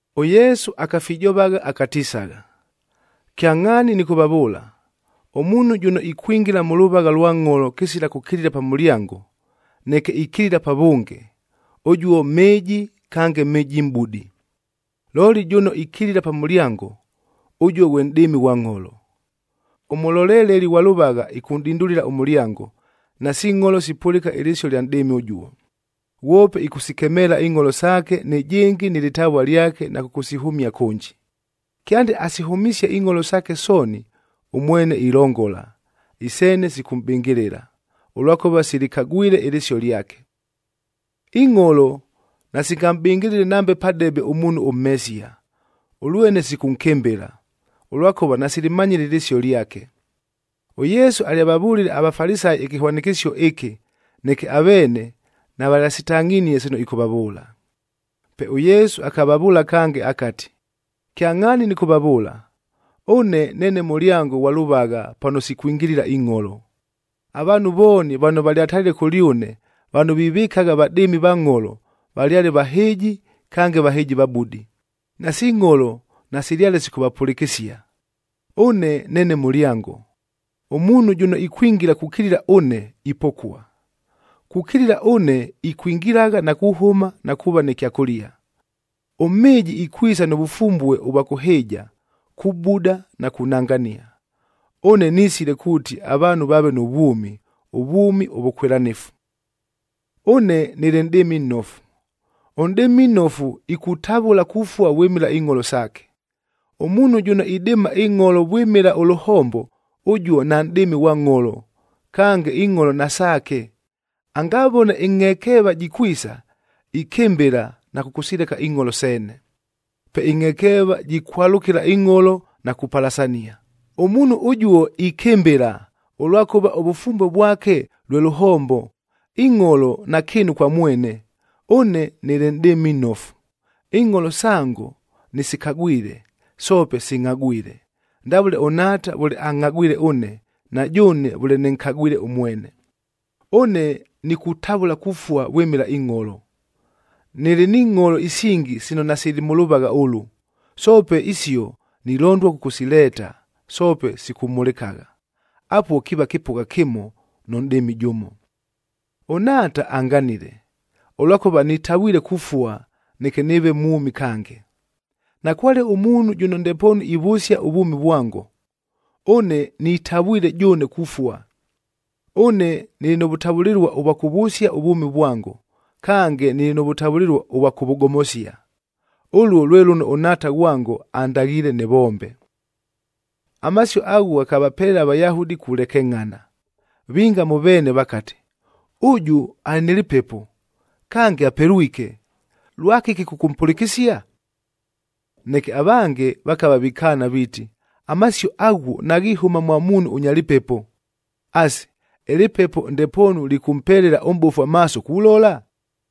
ɄYesu akafijovagha akatisagha, “Kyangʼhaani nɨkʉvavʉʉla, ʉmuunhu jʉno ikwingila mʉ lʉvagha lwa ngʼholo kɨsila kʉkilila pa mʉlyango, neke ikilila pavʉnge, ʉjuo mhɨɨji kange mhɨjimʼbudi. Looli jʉno ikilila pa mʉlyango, ʉjuo ghwe nʼdɨɨmi ghwa ngʼholo. Ʉmʉloleleli ghwa lʉvagha ɨkʉnʼdindulila ʉmʉlyango, nasi ngʼholo sipʉlɨka ɨlɨsio ɨlya nʼdɨɨmi ʉjuo. Ghwope ɨkʉsikemeela ingʼholo saake nɨjɨngɨ nɨ lɨtavua lyake na kʉkʉsihʉmia kʉnji. Kyande asihʉmisie ingʼholo saake sooni, ʉmwene ilongola, iseene sikʉmʼbɨngɨlɨla, ʉlwakʉva silɨkagwile ɨlɨsio lyake. Ingʼholo nasingamʼbɨngɨlɨle nambe padebe ʉmuunhu ʉmhesia, ʉlwene sikʉnkɨmbɨla, ʉlwakʉva nasilɨmanyile ɨlɨsio lyake.” ɄYesu alyavavʉlile aVafalisayi ɨkɨhwanɨkɨsio ɨkɨ, neke aveene navalyasitangʼhinie sino ɨkʉvavʉʉla. Pe ʉYesu akavavʉʉla kange akati, “Kyangʼhaani nɨkʉvavʉʉla, ʉne neene mʉlyango ghwa lʉvagha pano sikwingilila ingʼholo. Avaanhu vooni vano valyatalile kʉlyʉne vano vivɨkagha vadɨɨmi va ngʼholo, valyale vahɨɨji kange vahɨjivabudi, nasi ngʼholo nasilyale sikʉvapʉlɨkɨsia. Ʉne neene mʉlyango, ʉmuunhu jʉno ikwingila kukilila ʉne, ipokua. Kukilila ʉne ikwingilagha na kuhʉma na kuuva nɨ kyakʉlia. Ʉmhɨɨji ikwisa nʉ vʉfumbue ʉvwa kʉhɨɨja, kubuda na kunangania. Ʉne nisile kuuti avaanhu vaave nʉ vwʉmi, ʉvwʉmi ʉvʉkwɨlanɨfu. “Ʉne nɨlɨ nʼdɨɨmi nnofu. Ʉnʼdɨɨmi ʉnnofu, ikutavʉla kufua vwɨmɨla ingʼholo saake. Ʉmuunhu jʉno idɨɨma ingʼholo vwɨmɨla ʉlʉhombo, ʉjuo nanʼdɨɨmi ghwa ngʼholo, kange ingʼholo nasaake, angavone ɨngʼhekeeva jikwisa, ikɨmbɨla na kʉkʉsileka ingʼholo seene. Pe ɨngʼhekeeva jikwalʉkɨla ingʼholo na kupalasania. Ʉmuunhu ʉjuo ikɨmbɨla, ʉlwakʉva ʉvʉfumbue vwake lwe lʉhombo, ingʼholo nakɨɨnu kwa mwene. Ʉne nɨlɨ nʼdɨɨmi nnofu. Ingʼholo sango nɨsikagwile, soope singʼhagwile, ndavʉle ʉNhaata vʉle angʼhagwile ʉne, na jʉʉne vʉle nɨnkagwile ʉmwene. Ʉne nikutavʉla kufua vwɨmɨla ingʼholo. Nɨlɨ ni ngʼholo isingi sino nasili mʉ lʉvagha ʉlʉ, soope isio nilondua kʉkʉsileeta, soope sikʉmhʉlɨkagha. Apuo kiiva kɨpʉgha kɨmo, nʉ nʼdɨɨmi jʉmo. “ɄNhaata anganile, ʉlwakʉva nitavwile kufua, neke nɨɨve mwʉmi kange. Nakwale ʉmuunhu jʉno ndepoonu ivʉsia ʉvwʉmi vwango. Ʉne nitavwile jʉʉne kufua. Ʉne nɨlɨ nʉ vʉtavʉlɨlua ʉvwa kʉvʉsia ʉvwʉmi vwango, kange nɨlɨ nʉ vʉtavʉlɨlua ʉvwa kʉvʉgomosia. Ʉluo lwe lʉno ʉNhaata ghwango andaghiile nɨvombe.” Amasio aghuo ghakapelela aVayahudi kulekengʼhana. Vinga mʉ veene vakati, “Ʉjʉ alɨ nɨ lɨpepo, kange apelwike. Lwakɨki kʉkʉmpʉlɨkɨsia?” Neke avange vakava vikaana viiti, “Amasio aghuo naghihʉma mwa muunhu ʉnya lɨpepo. Asi, ɨlɨpepo ndepoonu lɨkʉmpelela ʉmʼbofu amaaso kulola?”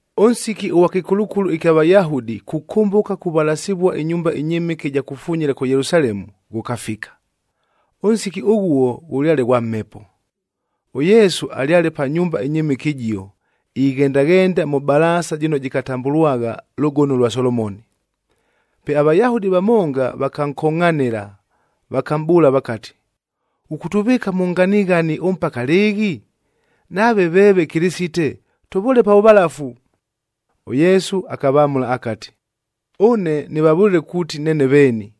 Ʉnsiki ʉghwa kɨkulukulu ɨkya Vayahudi kukʉmbʉka kuvalasivua ɨnyumba ɨnyɨmɨke ɨja kufunyila kʉ Yelusalemu, ghʉkafika. Ʉnsiki ʉghuo ghʉlyale ghwa mhepo. ɄYesu alyale pa nyumba ɨnyɨmɨke ɨjio, ighendaghenda mʉ balaasa jɨno jɨkatambʉlwagha Lʉgono lwa Solomoni. Pe aVayahudi vamonga vakankongʼhanɨla, vakamʼbʉʉla vakati, “Ghʉkʉtʉvɨɨka mʉ nganighani ʉmpaka lɨɨghi? Nave veeve Kɨlɨsite, tʉvʉʉle pa vʉvalafu!” ɄYesu akavamʉla akati, “Ʉne nɨvavʉlile kuuti neene veeni,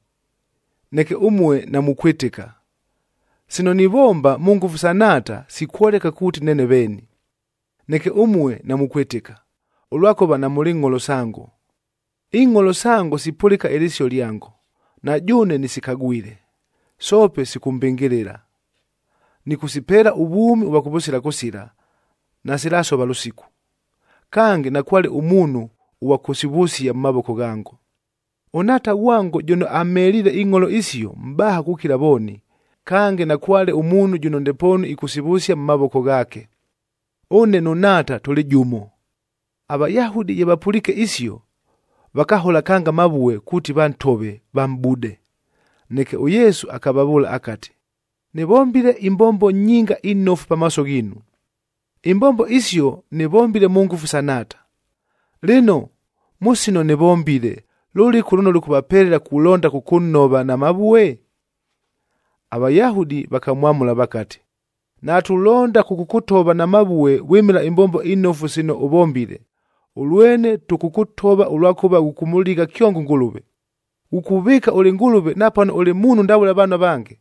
neke ʉmue namukwɨtɨka. Sino nivomba mʉ ngʉfu sa Nhaata, sikwoleka kuuti neene veeni. Neke ʉmue namukwɨtɨka, ʉlwakʉva namʉlɨ ngʼholo sango. Ingʼholo sango sipʉlɨka ɨlɨsio lyango, na jʉʉne nɨsikagwile, soope sikʉmbɨngɨlɨla. Nɨkʉsipeela ʉvwʉmi ʉvwa kʉvʉsila kʉsila, nasilasova lʉsiku. Kange, nakwale ʉmuunhu ʉghwa kʉsivʉsia mʉ mavoko ghango. ɄNhaata ghwango jʉno amheliile ingʼholo isio, mʼbaha kukila vooni, kange nakwale ʉmuunhu jʉno ndepoonu ɨkʉsivʉsia mʉ mavoko ghaake. Ʉne nʉ Nhaata tʉlɨ jʉmo.” AVayahudi ye vapʉliike isio, vakahola kange amavue kuuti vantove, vamʼbude. Neke ʉYesu akavavʉʉla akati, “Nɨvombile imbombo nyinga inofu pamaaso ghiinu. Imbombo isio nɨvombile mʉ ngʉfu sa Nhaata. Lɨno, mʉ sino nɨvombile, lʉlɨku lʉno lʉkʉvapelela kulonda kʉkʉnhova na mavue?” AVayahudi vakamwamʉla vakati, “Natulonda kʉkʉkʉtova na mavue vwɨmɨla imbombo inofu sino ʉvombile, ʉlwene tʉkʉkʉtova ʉlwakʉva ʉkʉmʉligha kyongo ʉNgʉlʉve. Ghukuvɨɨka ʉlɨ Ngʉlʉve napano ʉlɨ muunhu ndavʉle avaanhu avange!”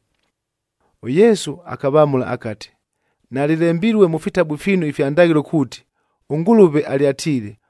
ɄYesu akavamʉla akati, “Nalɨlembilue mʉ fitabu fiinu ifya ndaghɨlo kuuti, ʉNgʉlʉve alyatiile,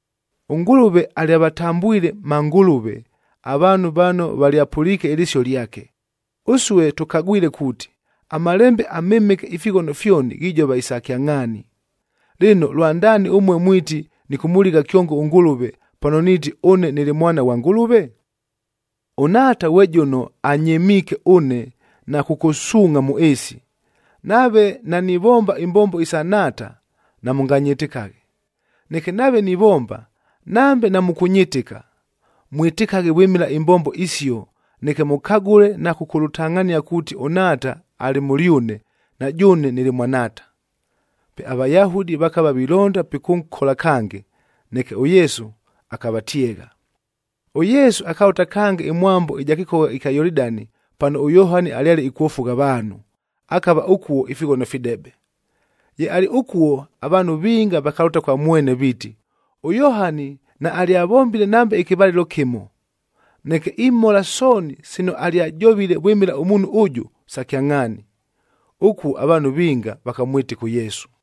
ɄNgʉlʉve alyavatambwile ‘mangʉlʉve’ avaanhu vano valyapʉliike ɨlɨsio lyake, ʉsue tʉkagwile kuuti, aMalembe aMɨmɨke ifighono fyoni ghijova isa kyangʼhaani. Lɨno, lwandaani ʉmue mwiti nɨkʉmʉligha kyongo ʉNgʉlʉve, pano niiti, ‘Ʉne nɨlɨ Mwana ghwa Ngʉlʉve’? ɄNhaata ghwe jʉno anyɨmiike ʉne na kʉkʉsuungʼha mʉ ɨɨsi. Nave nanivomba imbombo isa Nhaata, namʉnganyɨtɨkaghe. Neke nave nivomba, nambe namʉkʉnyɨtɨka, mwɨtɨkaghe vwɨmɨla imbombo isio neke mʉkagʉle na kʉkʉlʉtangʼhania kuuti ʉNhaata alɨ mʉlyʉne, na jʉʉne nɨlɨ mwa Nhaata.” Pe aVayahudi vakava vilonda pikʉnkola kange, neke ʉYesu akavatyegha. ɄYesu akalʉta kange ɨmwambo ɨja kɨkogha ɨkya Yolidani, pano ʉYohani alyale ikwofugha avaanhu, akava ʉkuo ifighono fidebe. Ye alɨ ʉkuo, avaanhu vinga vakalʉta kwa mwene viiti, “ɄYohani naalyavombile nambe ɨkɨvalɨlo kɨmo, neke imhola sooni sino alyajovile vwɨmɨla ʉmuunhu ʉjʉ, sa kyangʼhaani.” Ʉkuo avaanhu vinga vakamwɨtɨka ʉYesu.